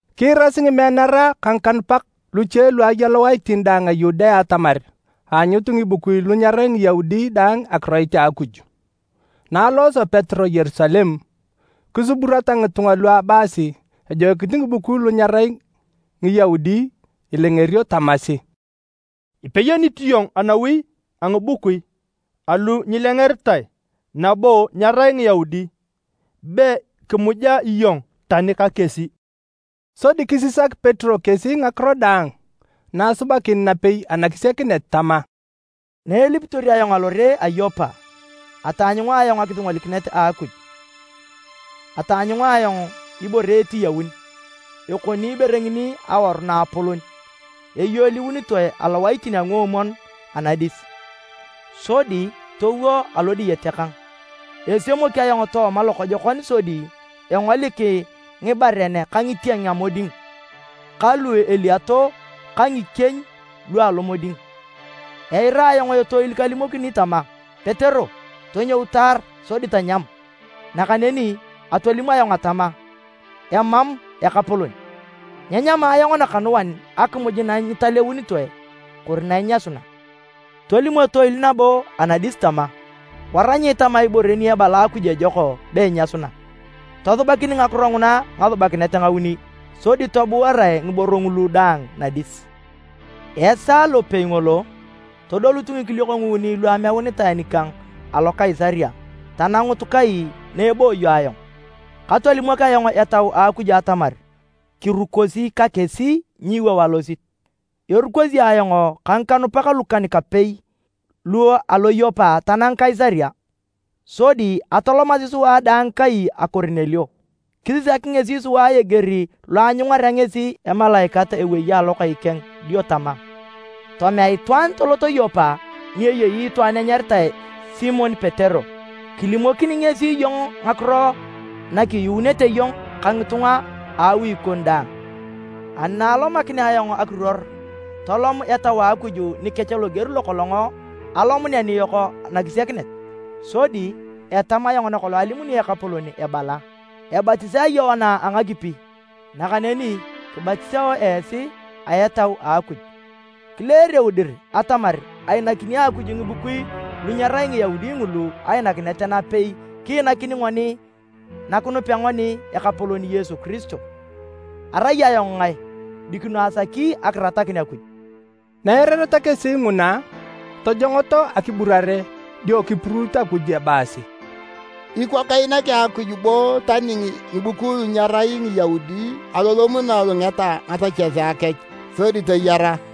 Kiirasi ngimeanara ka ngikanupak luche lu aya lowaitin daang a Yudea atamar aanyut ngibukui lu nyerai Ngiyaudi dang akiroit a Akuj. Na alosio Petero Yerusalem, kisuburata ngitunga lu abaasi ejoikinit ngibukui lu nyerai Ngiyaudi ilengerio tamasi, “Ipeyonit iyong anawi a ngibukui alu nyilengeritae nabo nyerai Ngiyaudi, be kimuja iyong tani ka kesi!” Sodi kisisak Petero kesi ngakiro daang na asubakin napei anakisiakinet tama, “Naelipitor ayong alore a Yopa, ataanyunga akisingolikinet a Akuj. Ataanyunga ayong ibore etiyaun, ekoni ibore ngini awaru naapolon, eyoliunitoe alowaitin a nguomwon anadis, sodi towo alo diyete kang. Esemok ayong tooma lokojokon sodi engolik ngibaren ka ngitieng a moding ka lu eliato ka ngikieny lu alomoding. Eira ayong etoil kalimokini tama, ‘Petero, tonyou taar sodi tanyam!’ Nakaneni atolim ayong atama, ‘Emam, Ekapolon! Nyenyama ayong nakanuan akimuj na nyitaleunitoe kori na inyasuna.’ Tolim etoil nabo anadis tama, ‘Wara nyiitama ibore ni ebala Akuj ejok be inyasuna.’ Tosubakin ngakiro nguna ngasubakinet ngauni, sodi tobuarae ngiboro ngulu daang nadis. Esaa lopei ngolo, todolut ngikiliok nguuni lu ameunitae nikang alo Kaisaria tanangut kai na ebooyo ayong. Katolimok ayong Etau a Akuj atamar kirukosi ka kesi nyiiwou alosit. Erukosi ayong ka ngikanupak lukan-kapei lu alo Yopa tanang Kaisaria. Sodi atolomasi sua daang kai a Korinelio. Kisisak ngesi sua eger lo aanyungarea ngesi emalaikat ewei alokai keng dio tama, ‘Tomea itwaan tolot Yopa ni eyei itwaan enyaritae Simon Petero. Kilimokini ngesi iyong ngakiro na kiyuunete iyong ka ngitunga a awi kon daang.’ Ani na alomakinea ayong akiruor, tolom Etau a Akuj nikech loger lokolong alomunea niyok anakisiakinet. Sodi etamu ayong nakolong alimuni ekapolon ebala, ‘Ebatisae Yoana a ngakipi, nakaneni kibatisao esi a Etau a Akuj.’ Kileereu dir atamar ainakini Akuj ngibukui lu nyerai Ngiyaudi ngulu ainakinet napei kiinakini ngoni na kinupea ngoni Ekapolon Yesu Kiristo. Arai ayong ngae, dikino asaki akiratakin Akuj?” Na eirareta kesi nguna, tojongoto akiburare dio kipuruut Akuj ebaasi, “Ikwa keinaki Akuj bo tani ngibukui lu nyerai Ngiyaudi alolom na elungeta ngasechesea kech sodi toyara!”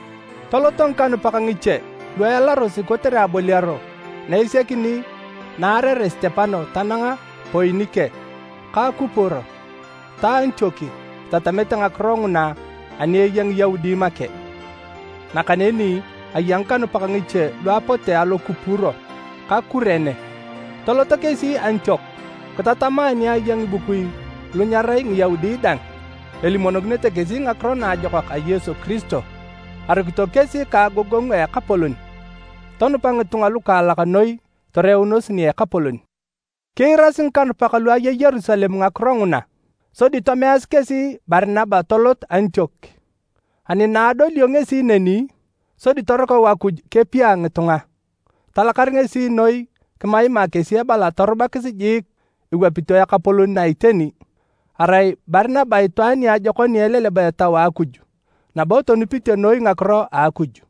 Toloto ngikanupak ngiche lu ealarosi kotere aboliaro na esiakini na aarere Sitepano tananga Poinike ka Kupuro ta Antiok itatamete ngakiro nguna ani eya Ngiyaudi make. Nakaneni aya ngikanupak ngiche lu apote alo Kupuro ka Kurene, toloto kesi Antiok kitatama ani aya ngibukui lu nyerai Ngiyaudi dang, elimonokinete kesi Ngakiro Naajokak a Yesu Kiristo. Arukito kesi ka agogongu a Ekapolon, tonupa ngitunga lukaalak noi toreunos nia Ekapolon. Kiirasi ngikanupak lu aya Yerusalem ngakiro nguna. Sodi tomeasi kesi Barinaba tolot Antiok. Ani na adolio ngesi neni, sodi torukau Akuj kepia ngitunga, talakar ngesi noi kimaima kesi ebala torubakis jik iwapito Ekapolon na a iteni. Arai Barinaba itwaan niajokon ni eleleba Etau a Akuj nabo tonupite noi ngakiro a Akuj.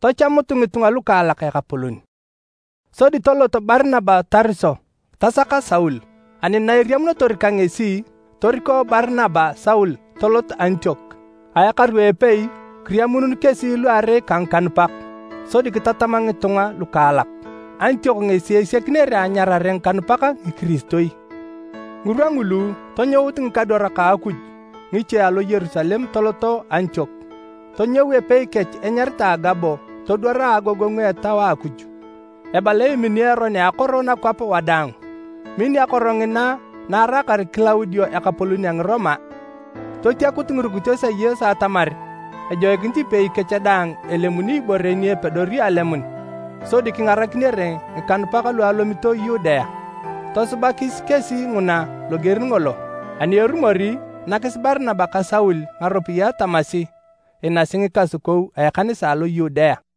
Tachamut ngitunga lukaalak Ekapolon. Sodi tolot Barinaba Tariso tasaka Saul. Ani na eriamunotor ka ngesi, toriko Barinaba Saul toloto Antiok. A ekaru a epei, kiriamuunun kesi luarei ka ngikanupak, sodi kitatama ngitunga lukaalak. Antiok ngesi esiakinere anyarare ngikanupak Ngikiristoi. Ngirwa ngulu, tonyout ngikadwarak a Akuj ngiche alo Yerusalem toloto Antiok. Tonyou epei kech enyaritae Agabo todwar a agogongu a Etau a Akuj ebala emini eron a akoro nakwap wadaang. (Min akoro ngina na araakar Kilaudio ekapolon a Ngiroma.) Totiakut ngirukitos a Yesu atamar ejoikinit ipei kech daang elemuni ibore ni epedori alemun sodi kingarakinere ngikanupak lu alomito Yudea. Tosubakis kesi nguna loger ngolo. Ani erumor, nakis Barinaba ka Saul ngaropiyae tamasi inasi ngikasukou a ekanisa alo Yudea.